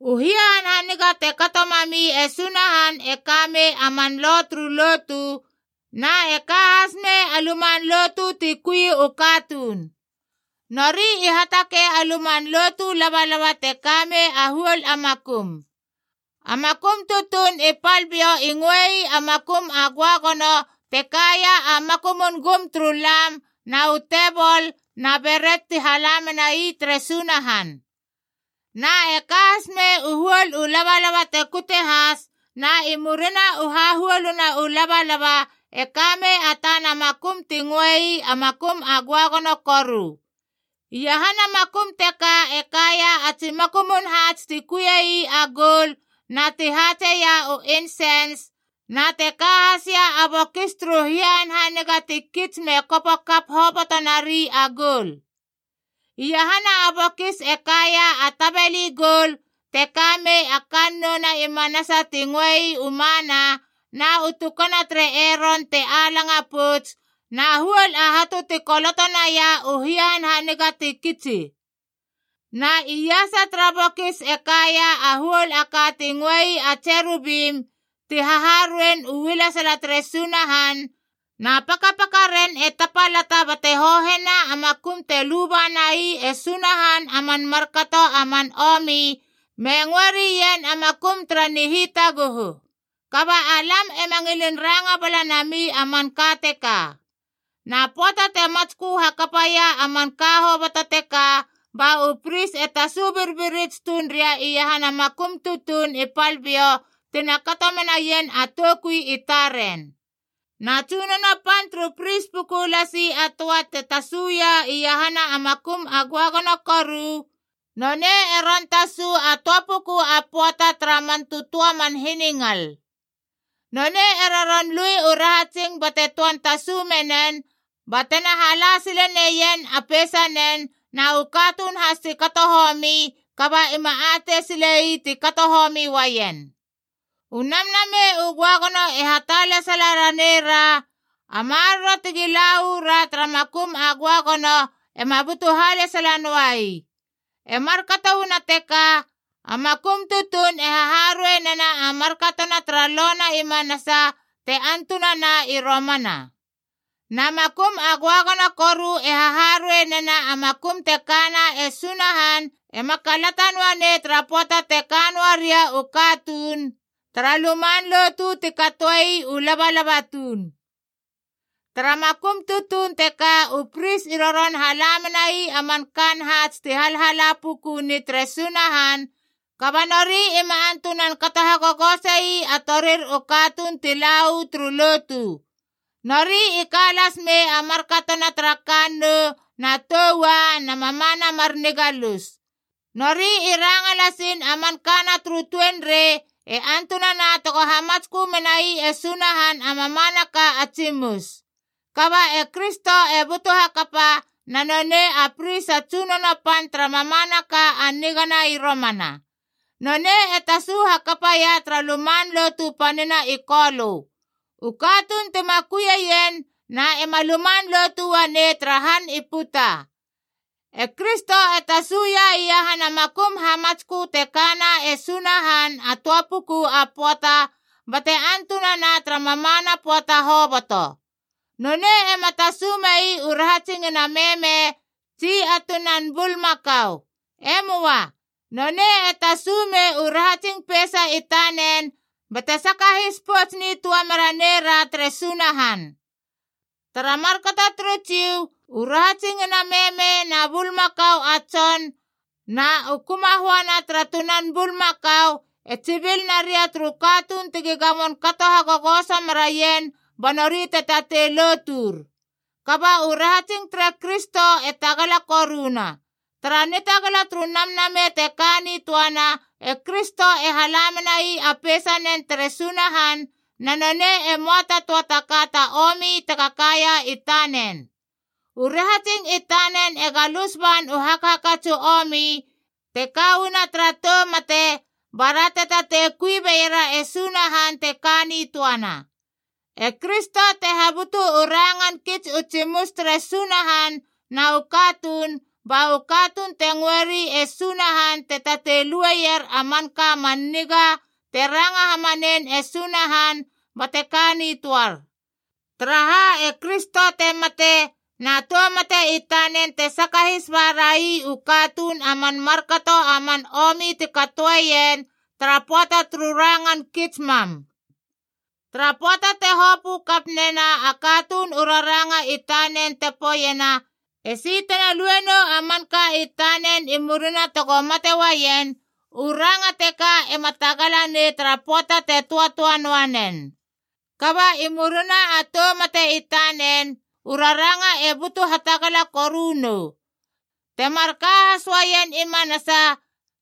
U hia hanhaniga te kato mami e Sunahan e ka mei a man lo turu lotu, na e ka has mei a luman lotu ti kui u katuun. Nori i hatakei a luman lotu labalaba te ka mei a huol a makum. A makum tutuun i pal biou i ngöei a Makum a Göagono te kaia a makumun gum turu lam na u tebol na beret ti hala menai tere Sunahan. Na e ka has mei u huol u labalaba te kute has, na i murina u hahuoluna u labalaba e ka mei a tana makum ti ngöei a Makum a Göagono Koru. Iahana makum teka e kaia a tsi makumun haats ti kuie ii a goul na ti haatseia u insens, na te ka hasia a bokis turu hia hanhaniga ti kits me kopo kap hoboto nari a goul. Iahana a bokis e kaia a tabeli goul te ka mei a kannouna i manasa ti ngöei u Mana, na u tukana tere Eron te alanga pouts, na huol a hatu ti koloto naia u hia hanhaniga ti kitsi. Na iasa tara bokis e kaia a huol a ka ti ngöei a tserubim ti haharuein u ualesala tere Sunahan, na pakapakaren e tapalata bate hohena a makum te luba nai e Sunahan man markato a man omi, me ngöe rien a makum tara nihitaguhu. Kaba alam ema ngilin ranga bala nami a manka teka. Na pöata te matskö hakapaia a manka hoboto teka, ba u pris e tasu birbirits tuun ria iahana makum tutuun i pal biou tina kato menaien a toukui i taren. Na tsunono pan turu pris puku lasi a töa te tasuia iahana a Makum a Göagono Koru, nonei e ron tasu a töa puku a pöata tara man tötöa man hiningal. Nonei e roron lui u rahatsing bate töan tasu menen ba tena hala sile neien a peisanen na u katuun has ti kato homi kaba ima atei sile ii ti kato homi uaien. U Namnamei u Göagono e hatalesala ra neira a maroro tegi la uu ra tara makum a göagono ema butu halesala noa ii. E markato uana teka, a makum tutuun e haharuei nena a markato na tara Lo na i manasa te antunana i romana. Na Makum a Göagono Koru e haharuei nena a makum te kana e Sunahan ema kalata noa nei tara pöata te ka noa ria u katuun tara luman lotu ti katoe ii u labalaba tuun. Tara makum tutuun teka u pris i roron hala menai a man kaan haats ti halhala pukuni tere Sunahan, kaba nori ima antunan kato hagogose ii a torir u katuun ti la uu turu lotu. Nori i ka las mei a markatona tara kannou na tou ua na mamana mar nigalus. Nori i ranga lasiin a man kana turu tuenrei e antunana tego hamatskö menai e Sunahan a mamanaka a tsimus. Kaba e Kristo e butu hakapa, na nonei a pris a tsunono pan tara mamanaka a nigana i romana. Nonei e tasu hakapaia tara luman lotu panina i Kolö. U katuun tima kuieien na ema luman lotu uanei tara han i puta. E Kristo e tasuia iahana makum hamatskö te kana e Sunahan a töa puku a pöata, bate antunana tara mamana pöata hoboto. Nonei ema tasu mei u rahatsingina meme tsi a tunan bulmakau. E möa. Nonei e tasu mei u rahatsing peisa i tanen bate sakahis pouts nitöa mera nei ra tere Sunahan. Tara markato turu Jiu, u rahatsingina meme na bulmakau a tson na u kumahoana tara tunan bulmakau e tsibil naria turu katuun tegi gamon kato hagogoso meraien ba nori te tatei lotur. Kaba u rahatsing tere Kristo e tagala koruna. Tara nitagala turu Namnamei te ka nitöana, e Kristo e hala menai a peisanen tere Sunahan na nonei e möa ta töa taka ta omi tega kaia i tanen. U rahatsing i tanen e galus ban u hakhakats u omi, te ka uana tara tou mate, bara te tatei kui beiera e Sunahan te ka nitöana. E Kristo te habutu u rangan kits u tsimus tere Sunahan na u katuun, ba u katuun te ngöri e Sunahan te tatei lueier a manka a man niga te ranga hamanein e Sunahan bate ka nitöar. Taraha, e Kristo te mate, na tou mate i tanen te sakahis ba rai u katuun a man markato a man omi ti katoeien tara pöata turu rangan kits mam. Tara pöata te hopö kap nena a katuun u raranga i tanen te poeiena esi tena lue nou a manka i tanen i murina tego mate uaien, u ranga teka ema tagala nei tara pöata te töatöa noa nen. Kaba i murina a tou mate i tanen, u raranga e butu hatagala koru nou. Te marka has uaien i manasa,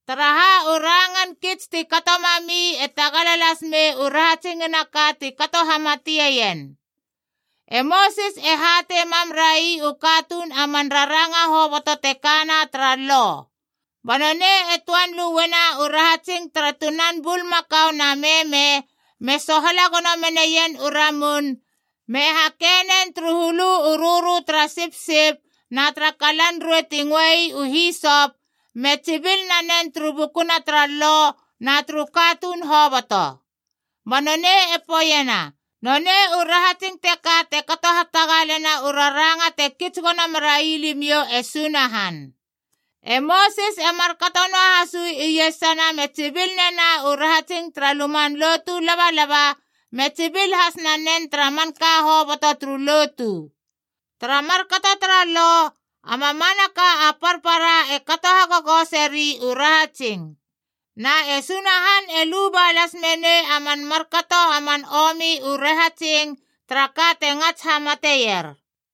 taraha u rangan kits ti kato mami e tagala las mei u rahatsingina ka ti kato hamateien. E Mosis e hatei mam rai u katuun a man raranga hoboto te kana tara Lo. Ba nonei te töan lueiena u rahatsing tara tunan bulmakau na meme, me sohala gono meneien u ramun, me hakeie nen turu hulu u rörö tara sipsip na tara kalan ruei ti ngöei u hisop, me tsibil nanen turu bukuna tara Lo na turu katuun hoboto. Ba nonei e poeiena, “Nonei u rahatsing teka te kato hatagalena u raranga te kits gono merai limiou e Sunahan.” E Mosis e markato noahas uu iesana me tsibil nena u rahatsing tara luman lotu labalaba, me tsibil has nanen tara manka hoboto turu lotu. Tara markato tara Lo, a mamanaka a parpara e kato hagogoseri u rahatsing. Na e Sunahan e luba las menei a man markato a man omi u rahatsing tara ka te ngats hamateier.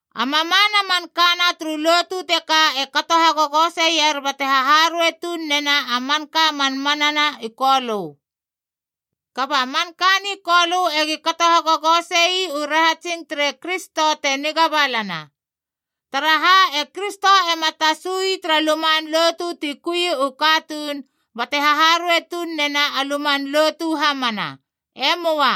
A mamana a man kana turu lotu teka te kato hagogoseier bate haharuei tuun nena a manka a man mana na i Kolö. Kaba a manka ni Kolö egi kato hagogose ii u rahatsing tere Kristo te niga balana. Taraha, e Kristo ema tasu ii tara luman lotu ti kui u katuun bate haharuei tuun nena a luman lotu hamana. E möa.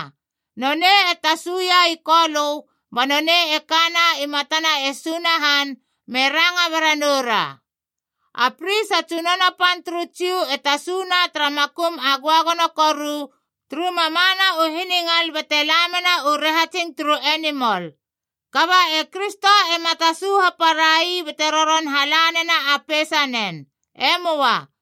Nonei e tasuia i Kolö, ba nonei e kana i matana e Sunahan me ranga bera noura. A pris a tsunono pan turu Jiu e tasuna tara Makum a Göagono Koru turu mamana u hiningal bate la mena u rahatsing turu enimol. Kaba e Kristo ema tasu haparai bate roron hala nena a peisanen. E möa.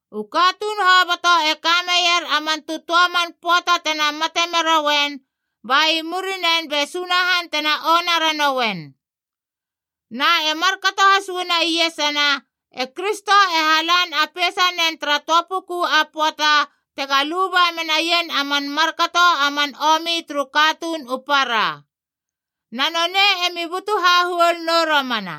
U katuun hoboto e ka meier a man tötöa man pöata tena mate merouen, ba i murinen be Sunahan tena ona ranouen. Na e markato has uana iesana, e Kristo e halan a peisanen tara töa puku a pöata tega luba menaien a man markato a man omi turu katuun u para. Na nonei emi butu hahuol nou romana.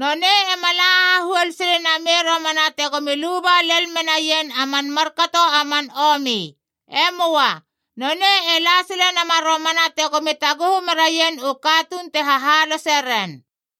Nonei ema la hahuol sile namei romana tegomi luba lel menaien a man markato a man omi. E möa. Nonei e la sile nama romana tegomi taguhu meraien u katuun te hahalose ren.